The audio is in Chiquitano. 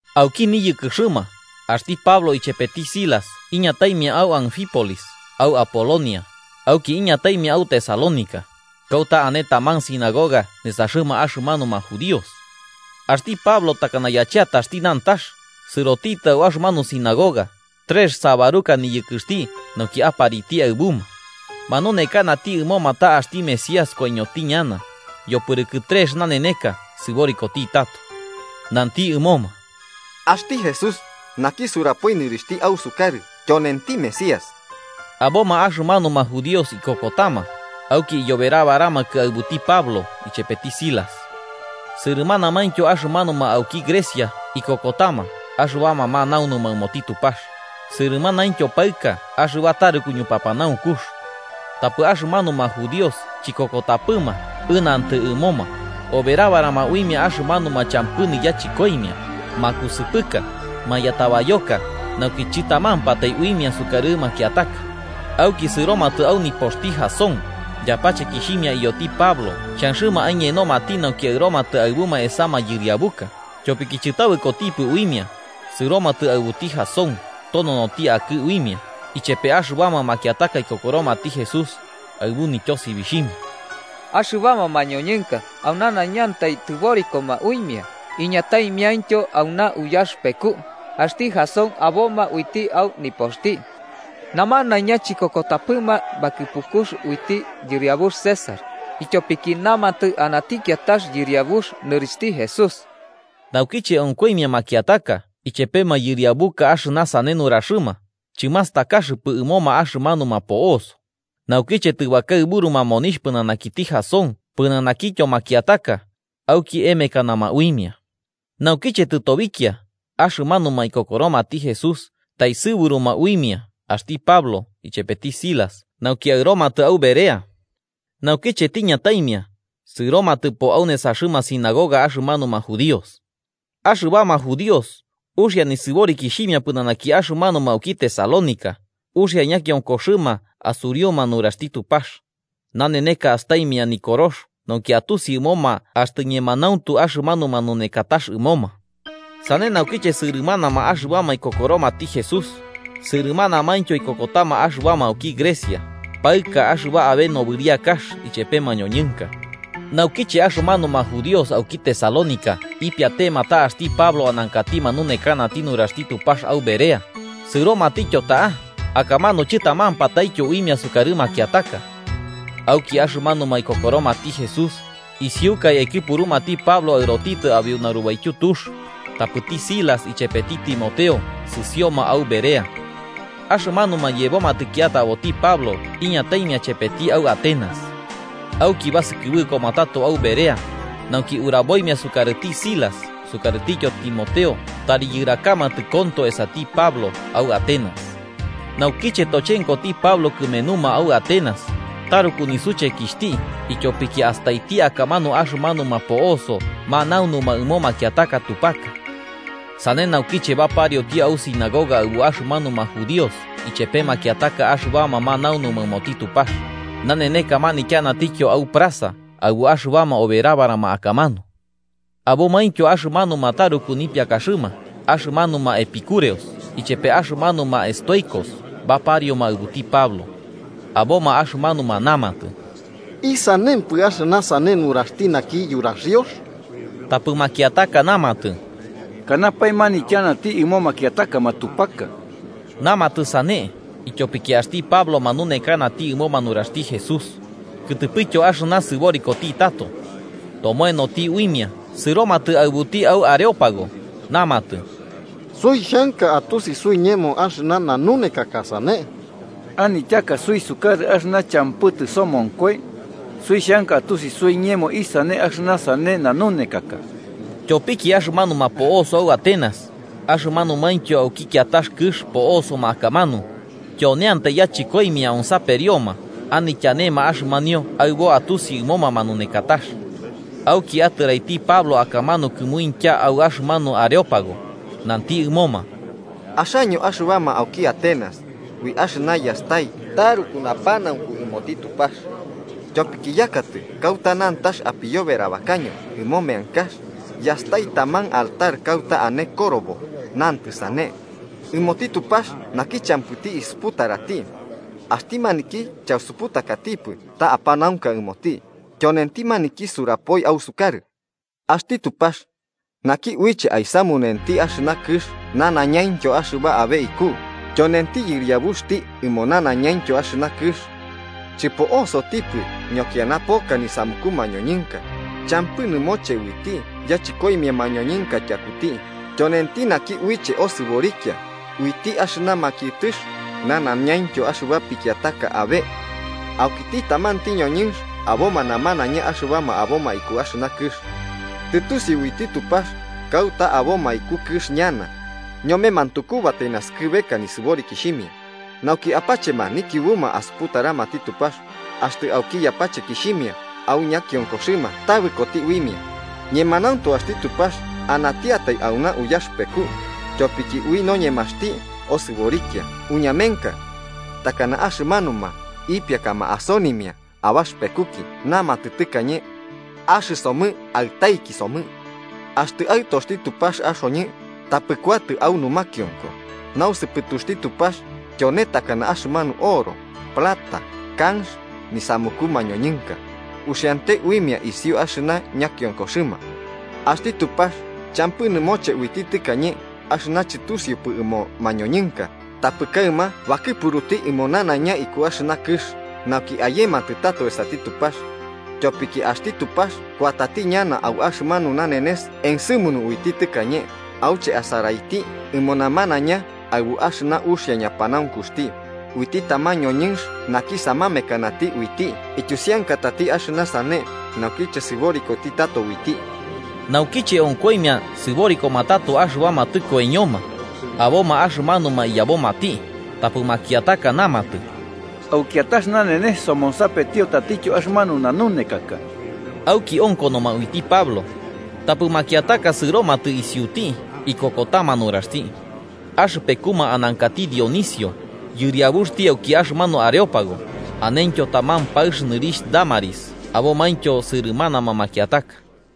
Auki niyɨkɨxɨma, axti Pablo ichepeti Silas iñataimia au Anfípolis au Apolonia, auki iñataimia au Tesalónica, kauta ane taman sinagoga nesaxɨma axɨmanuma judíos. Axti Pablo takana yacheataxti nantax, sɨrotitɨ au axɨmanu sinagoga, trex sabaruka niyɨkɨxti, nauki apariti aɨbuma. Manunekanati ɨmoma ta axti Mesías koiñoti ñana, yopɨrɨkɨ trex naneneka sɨborikoti tato. Nanti ɨmoma: –Axti Jesús, naki surapoi nɨrixhti ausukarɨ, tyonenti Mesías. Aboma axɨmanuma judíos ikokotama, auki iyoberabaramakɨ aɨbuti Pablo ichepeti Silas. Sɨrɨmanamaintyo axɨmanuma auki Grecia ikokotama axɨbama manaunuma ɨmoti Tupax, sɨrɨmanaintyo paɨka axɨba taruku ñupapanaunkux. Tapɨ axɨmanuma judíos chikokotapɨma ɨnantɨ ɨmoma, oberabarama uimia axɨmanuma champɨ niyachɨkoimia, makusɨpɨka, mayatabayoka nauki chɨtamampatai uimia sukarɨ makiataka. Auki sɨromatɨ au nipoxti Jasón, yapachekixhimia iyoti Pablo xhanxɨma aiñenomati nauki aɨromatɨ aɨbuma esa mayɨriabuka, tyopiki chɨtabɨkopɨma uimia, sɨromatɨ aɨbuti Jasón tononoti akɨ uimia ichepe axɨbama makiataka ikokoromati Jesús, aɨbu nityosibixhimia: –¡Axɨbama mañoñɨnka au nanaiñanti tɨborikoma uimia, iñataimiaintyo auna uyaxɨpeku, axti Jasón aboma uiti au nipoxti! ¡Namanaiña chikokotapɨma bakɨpukux uiti yɨriabux César, ityopiki namatɨ anati kiatax yɨriabux, nɨrixhti Jesús! Naukiche onkoimia makiataka ichepe mayɨriabuka axɨna sane nuraxɨma, chɨmastakaxɨpɨ ɨmoma axɨmanuma po'oso. Naukiche tɨbakaɨbɨruma monixh pɨnanakiti Jasón pɨnanakityo makiataka, auki emekanama uimia. Naukiche tɨtobikia, axɨmanuma ikokoromati Jesús, taesɨburuma uimia axti Pablo ichepeti Silas nauki aɨromatɨ au Berea. Naukiche tiñataimia, sɨromatɨpo au nesaxɨma sinagoga axɨmanuma judíos. Axɨbama judíos, uxia nisɨborikixhimia pɨnanaki axɨmanuma auki Tesalónica, uxia ñakiokoxɨma asuriuma nuraxti Tupax, naneneka astaimia Nikorox nauki atusi ɨmoma axtɨ ñemanauntu axɨmanu manunekatax ɨmoma. Sane naukiche sɨrɨmanama axɨbama ikokoromati Jesús, sɨrɨmanamaintyo ikokotama axɨbama auki Grecia, paɨka axɨba ane nobɨriakax ichepe mañoñɨnka. Naukiche axɨmanuma judíos auki Tesalónica ipiatema ta axti Pablo anankati manunekanati nuraxti Tupax au Berea, sɨromatityo ta'a, akamanu chɨtamampataityo uimia sukarɨ makiataka. Auki axɨmanuma ikokoromati Jesús, isiukai aikɨpurumati Pablo aɨrotitɨ abeu narubaityu tux, tapɨti Silas ichepeti Timoteo sɨsioma au Berea. Axɨmanuma yebomatɨ kiataboti Pablo iñataimia chepeti au Atenas. Auki basɨkɨbɨkoma tato au Berea, nauki uraboimia sukarɨti Silas sukarɨtityo Timoteo tari yɨrakamatɨ konto esati Pablo au Atenas. Naukiche tochenkoti Pablo kɨmenuma au Atenas, taruku nisuchekixhti ityopiki astaiti akamanu axɨmanuma po'oso manaunuma ɨmo makiataka matupaka. Sane naukiche baparioti au sinagoga aɨbu axɨmanuma judíos ichepe makiataka axɨbama manaunuma ɨmoti Tupax, naneneka manityanatityo au plaza aɨbu axɨbama oberabarama akamanu. Abomaintyo axɨmanuma taruku nipiakaxɨma axɨmanuma epicúreos ichepe axɨmanuma estoicos baparioma aɨbuti Pablo. Aboma axɨmanuma namatɨ: –¿Isanempɨ axɨna sane nuraxti naki yuraxiox? Tapɨ makiataka namatɨ: –¿Kanapae manityanati ɨmo makiataka matupaka? Namatɨ sane ityopiki axti Pablo manunekanati ɨmoma nuraxti Jesús, kɨtɨpɨtyo axɨna sɨborikoti tato. Tomoenoti uimia sɨromatɨ aɨbuti au Areópago, namatɨ: –Suixhanka atusi suiñemo axɨna nanunekaka sane. Anityaka suisukarɨ axɨna champɨ tɨsomonkoi, suixhanka atusi suiñemo isane axɨna sane nanunekaka. Tyopiki axɨmanuma po'oso au Atenas, axɨmanumaintyo auki kiatax kɨx po'osoma akamanu, tyoneantai yachɨkoimia onsaperioma anityanema axɨmanio aɨbo atusi ɨmoma manunekatax. Auki atɨraiti Pablo akamanu kɨmuintya au axɨmanu Areópago, nanti ɨmoma: “Axaño axɨbama auki Atenas, ui axɨna yastai taruku napanaunku ɨmoti Tupax. Tyopiki yakatɨ kauta nantax apiyoberabakaño ɨmo meankax, yastai taman altar kauta ane korobo, nantɨ sane: ‘Ɨmoti Tupax naki champɨti isuputarati.’ Axti maniki chausuputakatipɨ ta apanaunka ɨmoti, tyonenti maniki surapoi ausukarɨ. “Axti Tupax naki uiche aisamunenti axɨna kɨx nanaiñaintyo axɨba abe iku, tyonenti yɨriabuxti ɨmo nanaiñaintyo kɨx. Chɨpo'osotipɨ ñokiana poka nisamuku mañoñɨnka, champɨ nɨmoche uiti yachɨkoimia mañoñɨnka tyakuti, tyonenti naki uiche osɨborikia, uiti axɨna makiɨtɨx nanaiñaintyo axɨba pikiataka abe. “Aukiti tamanti ñoñɨnx aboma namanaiña axɨbama aboma iku axɨna kɨx. Tɨtusiu uiti Tupax kauta aboma iku kɨx ñana, ñome mantukubatai naskɨbeka nisɨborikixhimia, nauki apachema nikiubuma asuputaramati Tupax, axtɨ auki yapachekixhimia au ñakionkoxɨma tabɨkoti uimia, ñemanauntu axti Tupax anatiatai auna uyaxɨpeku, tyopiki ui noñemaxti osɨborikia uñamenka. Takana axɨmanuma ipiakama asonimia abaxɨpekuki namatɨ tɨkañe: ‘Axɨsomɨ aɨtaiki somɨ.’ Axtɨ aɨtoxti Tupax axoñɨ, tapɨ kuatɨ au numakionko, nausɨpɨtuxti Tupax tyone takana axɨmanu oro, plata, kanx, nisamuku mañoñɨnka, uxiante uimia isiu axɨna ñakionkoxɨma. Axti Tupax champɨ nɨmoche uiti tɨkañe, axɨna chɨtusiupɨ ɨmo mañoñɨnka, tapɨ kaɨma bakɨpuruti ɨmo nanaiña iku axɨna kɨx nauki ayematɨ tato esati Tupax. Tyopiki axti Tupax kuatati ñana au axɨmanu nanenes ensɨmunu uiti tɨkañe, auche asaraiti ɨmo namanaiña aɨbu axɨna uxia ñapanaunkuxti, uiti taman ñoñɨnx naki samamekanati uiti ityusiankatati axɨna sane naukiche sɨborikoti tato uiti.” Naukiche onkoimia sɨborikoma tato axɨbama tɨkoiño, aboma axɨmanuma iyabomati tapɨ makiataka namatɨ: –Au kiatax nanenes somonsapetio tatityo axɨmanu nanunekaka. Auki onkonoma uiti Pablo. Tapɨ makiataka sɨromatɨ isiuti ikokotama nuraxti. Axɨpekuma anankati Dionisio, yɨriabuxti auki axɨmanu Areópago, anentyo taman paɨx nɨrixh Dámaris abomaintyo sɨrɨmanama makiataka.